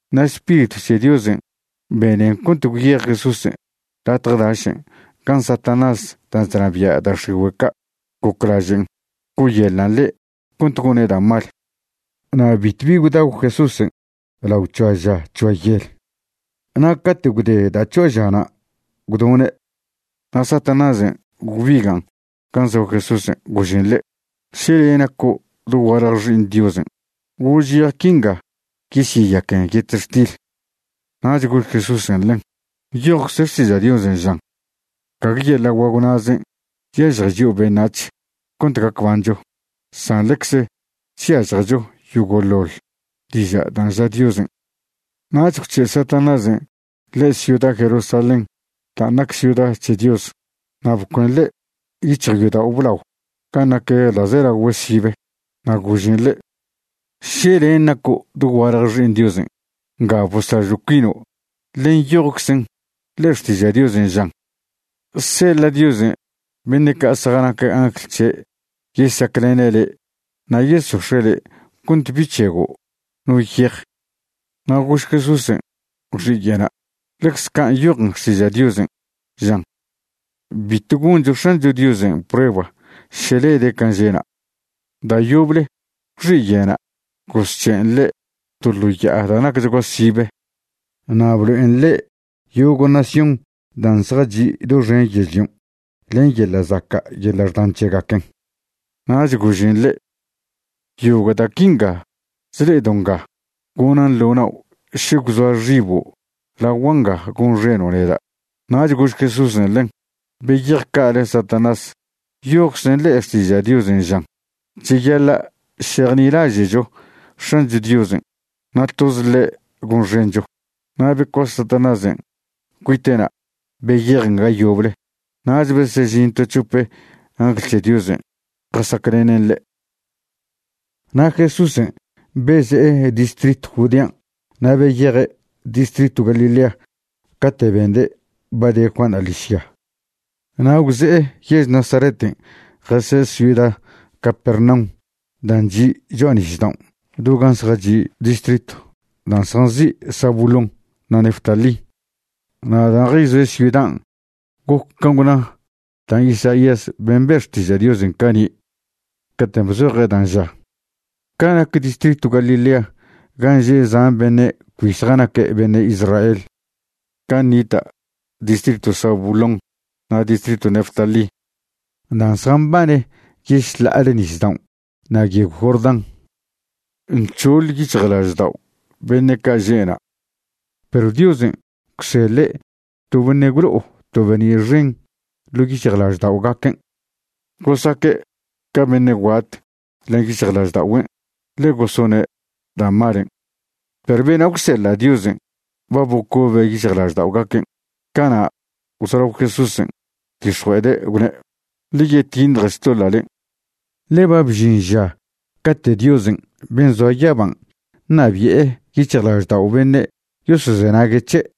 Na' Spiritw c̱he Diosen' benen cont gwyej Jesúsen' latje dašen' gan' Satanás dan' chnabia' da' x̱igüe' ca' goclažen' co'oyeḻan' ḻe' cont gone' da' mal. Na' bitwbi gwdagw Jesúsen' lao c̱hoa ža c̱hoa yel, na' cate' gwde da' c̱hoa žana' gwdone'. Na' Satanásen' gwbigan' gan' zoa Jesúsen', gožen ḻe': ―Še le' naco' dogualje Xi'iṉ Diosen', gož yej quinga yesyeyaquen yetextil. Nach gož Jesúsen' ḻen: ―Nyojcze Xtiža' Diosen' žan: “Gague yeḻa' guagw na'zen' chyažje chio' beṉac̱h cont gac bancho, san ḻecze chyažjecho yogo'ḻoḻ diža' dan' ža Diosen'.” Nach gwc̱he' Satanásen' ḻe' ciuda Jerusalén dan' nac ciuda c̱he Dios. Na' bcuen ḻe' yic̱hjo' yodao' blao gan' nac ḻa'zelagüe sibe, na' gožen ḻe': ―Še len' naco' dogualje Xi'iṉ Diosen', nga boslažo' cuino', ḻe nyojczen ḻe'e Xtiža' Diosen', žan: Seḻa' Diosen' beṉe' ca' zjanac angl c̱he' yesaclene' le', na' yesox̱e' le' cont bi c̱hego' no yej. Na' gož Jesúsen' gwxiye'na': ―Ḻecze can' nyojen Xtiža' Diosen', žan: “Bitw goncho X̱ancho Diosen' prueba še lede' can' že'na'.” Da' yoble gwxiye'na' gozc̱he'en ḻe' to ḻo ya'a da' nacchgua sibe, na' blo'en ḻe' yogo' nación dan' zjachi' doxen yežlion' len yeḻa' zaca' yeḻa' xdan c̱hegaquen. Nach gožen ḻe': ―Yogo' da' quinga chle'edo' nga gonan' ḻo nao' še gwzoa xibo' lagua' nga gonxeno' neda'. Nach gož Jesúsen' ḻen: ―Beyej ca'ale Satanás. Nyojczen ḻe'e Xtiža' Diosen' žan: “Cheyaḻa' šejnilaže'cho X̱ancho Diosen' na' toze ḻe' gonxencho.” Na' becuase Satanásen' cuite'na' beyejen ga yoble nach besežin to c̱hope angl c̱he Diosen' jasaclene' ḻe'. Na' Jesúsen' beze'e distritw Judean' na' beyeje' distritw Galilea cate' bende' ba de Juanṉa' ḻižya. Na' gwze'e yež Nazareten' jasoe' ciuda Capernaum dan' chi' cho'a nisdaon' do gan' zjachi' distritw dan' zjanzi' Zabulón na' Neftalí. Na' dan' jayzoe' ciudan' goc can' gwna da' Isaías ben' be' xtiža' Diosen' cani' caten' bzoje' dan' ža: Ca nac distritw Galilea gan' že' zan beṉe' cbi zjanaque' beṉe' Israel, gan' nita' distritw Zabulón na' distritw Neftalí dan' zjambane yešḻa'ale nisdaon' na' yegw Jordán, nc̱hoḻ yic̱hjlaždao' beṉe' ca' že' na'. Perw Diosen' gwseḻe' to beṉe' gwlo'o to be'ni' xen ḻo' yic̱hjlažda'ogaquen'. Gosaque' ca beṉe' guat len yic̱hjlažda'ogüen' ḻe gosone' da' malen', perw bena' gwseḻa' Diosen' ba bocobe' yic̱hjlažda'ogaquen'. Cana' gwzolao Jesúsen' gwdix̱jue'ede' gwne': ―Ḻe yetiṉje xtoḻa'len', ḻe ba bžin ža cate' Diosen' ben' zoa yaban' ṉabi'e yic̱hjlaždao' beṉe' yosozenague' c̱he'.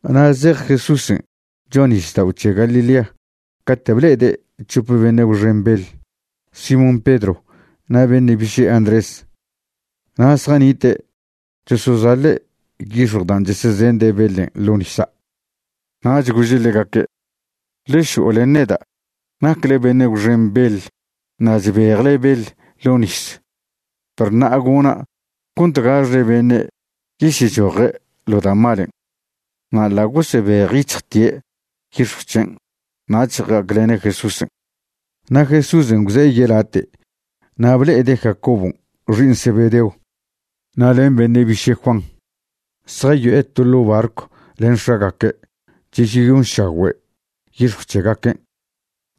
Na' zej Jesúsen' cho'a nisdao' c̱he Galilea cate' ble'ede' c̱hope beṉe' gwxen beḻ, Simón Pedro na' beṉe' biše' Andrés, na' zjanite' chosozaḻe' yix̱jw dan' chesezende' beḻen' ḻo' nisa'. Nach gože' ḻegaque': ―Ḻe šo'o len neda'. Nacle beṉe' gwxen beḻ, na' chbejle beḻ ḻo' nis, perw ṉa'a gona' cont gaxle beṉe' yesyechoje' ḻo da' malen'. Na' ḻa' gosebejyic̱hjte' yix̱jw c̱hen' nach ja'aclene' Jesúsen'. Na' Jesúsen' gwze'e yelate' na' ble'ede' Jacobon' xi'iṉ Zebedeo na' len beṉe' biše' Juan, zjayo'e to ḻo' barcw ḻen x̱agaque', chesyeyonšagüe' yix̱jw c̱hegaquen'.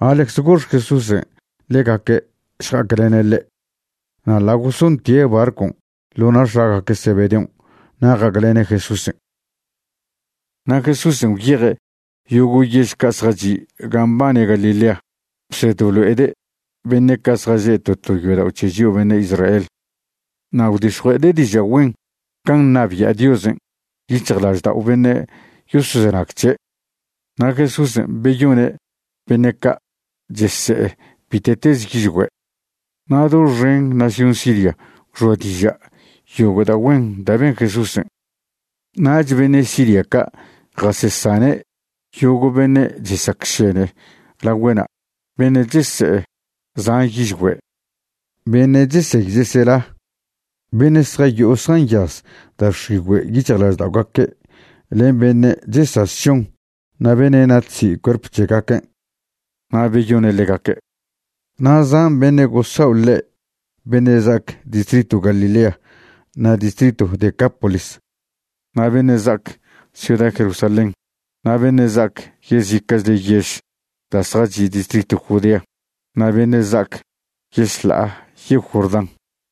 Na' ḻecze gox Jesúsen' ḻegaque' šja'aclene' ḻe'. Na' ḻa' gosontie' barcon' ḻo na' x̱agaque' Zebedeon' na' ja'aclene' Jesúsen'. Na' Jesúsen' gwyeje' yogo' yež ca' zjachi' gan' mbane Galilea, bsed blo'ede' beṉe' ca' zjaže' to to yodao' c̱he chio' beṉe' Israel. Na' gwdix̱jue'ede' diža' güen can' ṉabia' Diosen' yic̱hjlaždao' beṉe' yosozenag c̱he'. Na' Jesúsen' beyone' beṉe' ca' chese'e bite'teze yižgüe'. Na' doxen nación Siria gwxoa diža' yogo' da' güen da' ben Jesúsen'. Nach beṉe' Siria ca' jasesane' yogo' beṉe' chesacšene lagüe'na', beṉe' chese'e zan yižgüe', beṉe' chesey chesela, beṉe' zjayo'o zjanyaz da' x̱igüe' yic̱hjlažda'ogaque' len beṉe' chesaz šon na' beṉe' natsi' cuerp c̱hegaquen'. Na' beyone' ḻegaque'. Na' zan beṉe' gosao' ḻe', beṉe' za'ac distritw Galilea na' distritw Decápolis, na' beṉe' za'ac ciuda Jerusalén, na' beṉe' za'ac yezica'chle yež da' zjachi' distritw Judea, na' beṉe' za'ac yešḻa'a yegw Jordán.